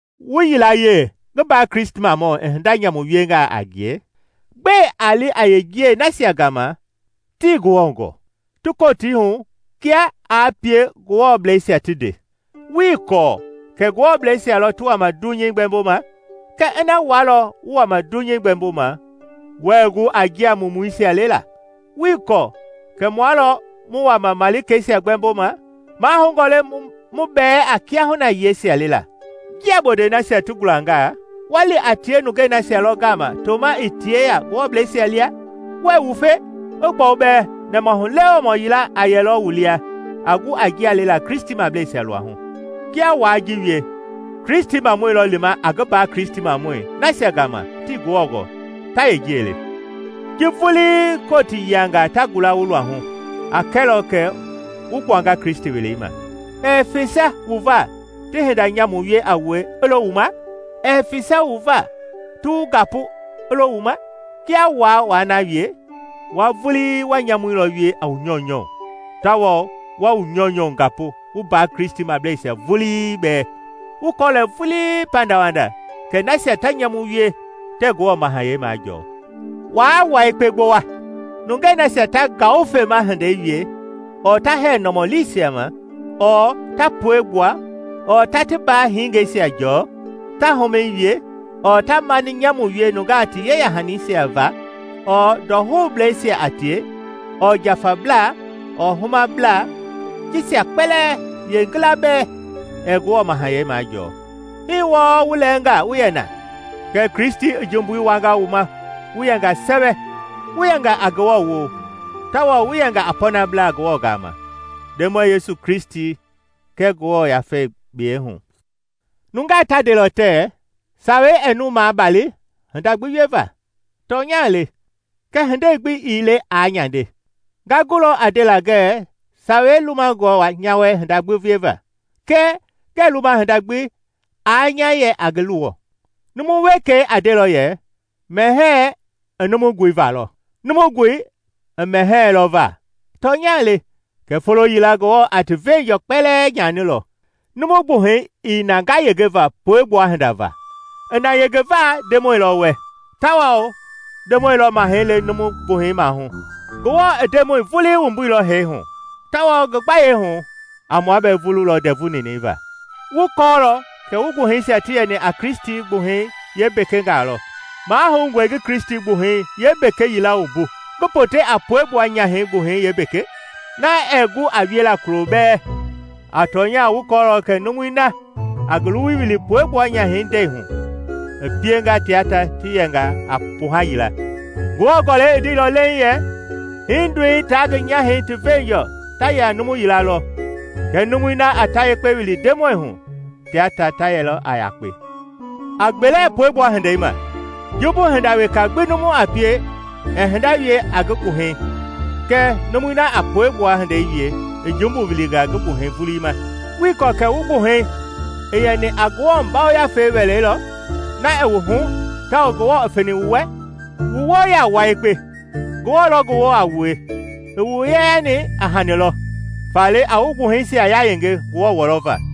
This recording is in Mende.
Wu yilayee ngi mbaa Kristimamɔi i hinda nyamu wiengaa a ngie, gbɛe a li a yeenjiɛi nasia gama tii Ngewɔ gɔɔ ti Kotii hu kia aa pie Ngewɔbleisia ti nde? Wuii kɔɔ kɛ Ngewɔbleisia lɔ ti wama dunyei gbɛmboma? Kɛ ina wua lɔ wu wama dunyei gbɛmboma, wuɛɛ gu a njia mumuisia lela? Wuii kɔɔ kɛ mua lɔ mu wama malikeisia gbɛmboma? Mahoungɔ le mu bɛɛ a kiahuna yiɛisia lela? Njia bondɛi nasia ti gulangaa, wa li a tie nungei nasia lɔ gama toma ii ti yeya Ngewɔmableisia lia? Wuɛɛ wufe? I gbɔu bɛɛ nɛmahulewemɔ yila a yɛlɔ wu lia a gu a njia lela Kristimableisia luahu. Kia waa ji wie, Kristimamɔi lɔ lima a ngi mbaa Kristimamɔi nasia gama tii Ngewɔ gɔɔ, ta yeenjiɛi le. Ji vulii Kotii yiangaa ta gula wu luahu a kɛlɔ kɛ wu gbuanga Kristi welei ma. Ɛɛ fesa wu va ti hinda nyamu wie a wue i lo wu ma? Ɛɛ fesa wu va ti wu gapu i lo wu ma? Kia waa na wie, wua vulii wa nyamui lɔ wie a wu nyɔunyɔ tawao wa wu nyɔunyɔ gapu wu mbaa Kristimableisia vulii bɛɛ. Wu kɔɔlɔ vulii pandawanda kɛ nasia ta nyamu wie tɛɛ Ngewɔ mahayɛi majɔɔ. Waa wua yekpe gbowa; nungei nasia ta ngawufema hindei wie ɔɔ ta hɛɛ nɔmɔliisia ma ɔɔ ta pueigbua ɔɔ ta ti mbaa hingeisia jɔɔ, ta humɛi wie, ɔɔ ta mani nyamu wie nungaa ti yeya-hanisia ma, ɔɔ ndɔhoubleisia a tie, ɔɔ njafablaa, ɔɔ humablaa, jisia kpɛlɛɛ yeengila bɛɛ ɛɛ Ngewɔ mahayɛi majɔɔ. Hii wɔɔ wu lɛɛnga wu yɛ na. Kɛɛ Kristi i jumbui wuanga wu ma wu yɛnga sɛwɛ, wu yɛnga a Ngewɔ woo; tawao wu yɛnga a pɔnablaa Ngewɔ gama, Ndemɔi Yesu Kristi kɛɛ Ngewɔ Yafei biyei hu. Nungaa ta ndelɔ tɛɛ, “Sawei ɛɛ mu maabali hinda gbi wieva.” Tɔnya le, kɛɛ hindei gbi ii le aa nyande. Nga gulɔ a ndela ngɛɛ Sawei lumangɔe nya wɛ hinda gbi wieva, kɛɛ ngɛɛ luma hinda gbi i nya yɛ a ngi luwɔ. Numu wekei a ndelɔ yɛ, “Mɛhɛɛ i numu goi va lɔ, numu goi i mɛhɛɛ lɔ va.” Tɔnya le, kɛɛ folo yila Ngewɔ a ti veenjɔɔ kpɛlɛɛ nyanilɔ. Numu gbuhɛi ii na ngayengeva puegbua hinda va, i na yengeva Ndemɔi lɔ wɛ; tawao Ndemɔi lɔ mahɛi le numu gbuhɛi maahu. Ngewɔ i Ndemɔi vuliilɔ i ngi wumbu hee hu, tawao ngi gbayei a mua bɛɛ vululɔ ndɛvu ninɛi va. Wu kɔɔlɔ kɛ wu gbuhɛisia ti yɛni a Kristi gbuhɛi yeembekengaa lɔ. Mahoungɔe ngi Kristi gbuhɛi yeembeke yila wumbu ngi pote a puegbua nyahɛi gbuhɛi yeembeke? Na ɛɛ gu a wiela kulo bɛɛ! A tɔnya wu kɔɔlɔ kɛ numui na a ngi luwui wili puegbua nyahɛi ndɛi hu i pienga tia ta ti yɛnga a kpuha yila. Ngewɔ Gɔlɛi i ndeilɔ leiŋ yɛ, “Hindoi taa ngi nyahɛi ti veenjɔɔ ta yɛ a numu yila lɔ.” Kɛɛ numui na a ta yekpe wili Ndemɔi hu tia ta ta yɛlɔ a yakpe. A gbele puegbua hinda ma. Jumbu hinda weka gbi numu a pie ɛɛ hinda wie a ngi gbuhɛi kɛɛ numui na a puegbua hindei wie i jumbu wulinga ngi gbuhɛi vulii ma. Wuii kɔɔ kɛ wu gbuhɛi i yɛni a Ngewɔ Yafei wɛlei lɔ, na i wu hu tawao Ngewɔ i feni wu wɛ? Wu woo yaa wua yekpe, Ngewɔ lɔ ngi woo a wue; i wu yeyani a hani lɔ. Faale a wu gbuhɛisia yayenge Ngewɔ wɔlɔva.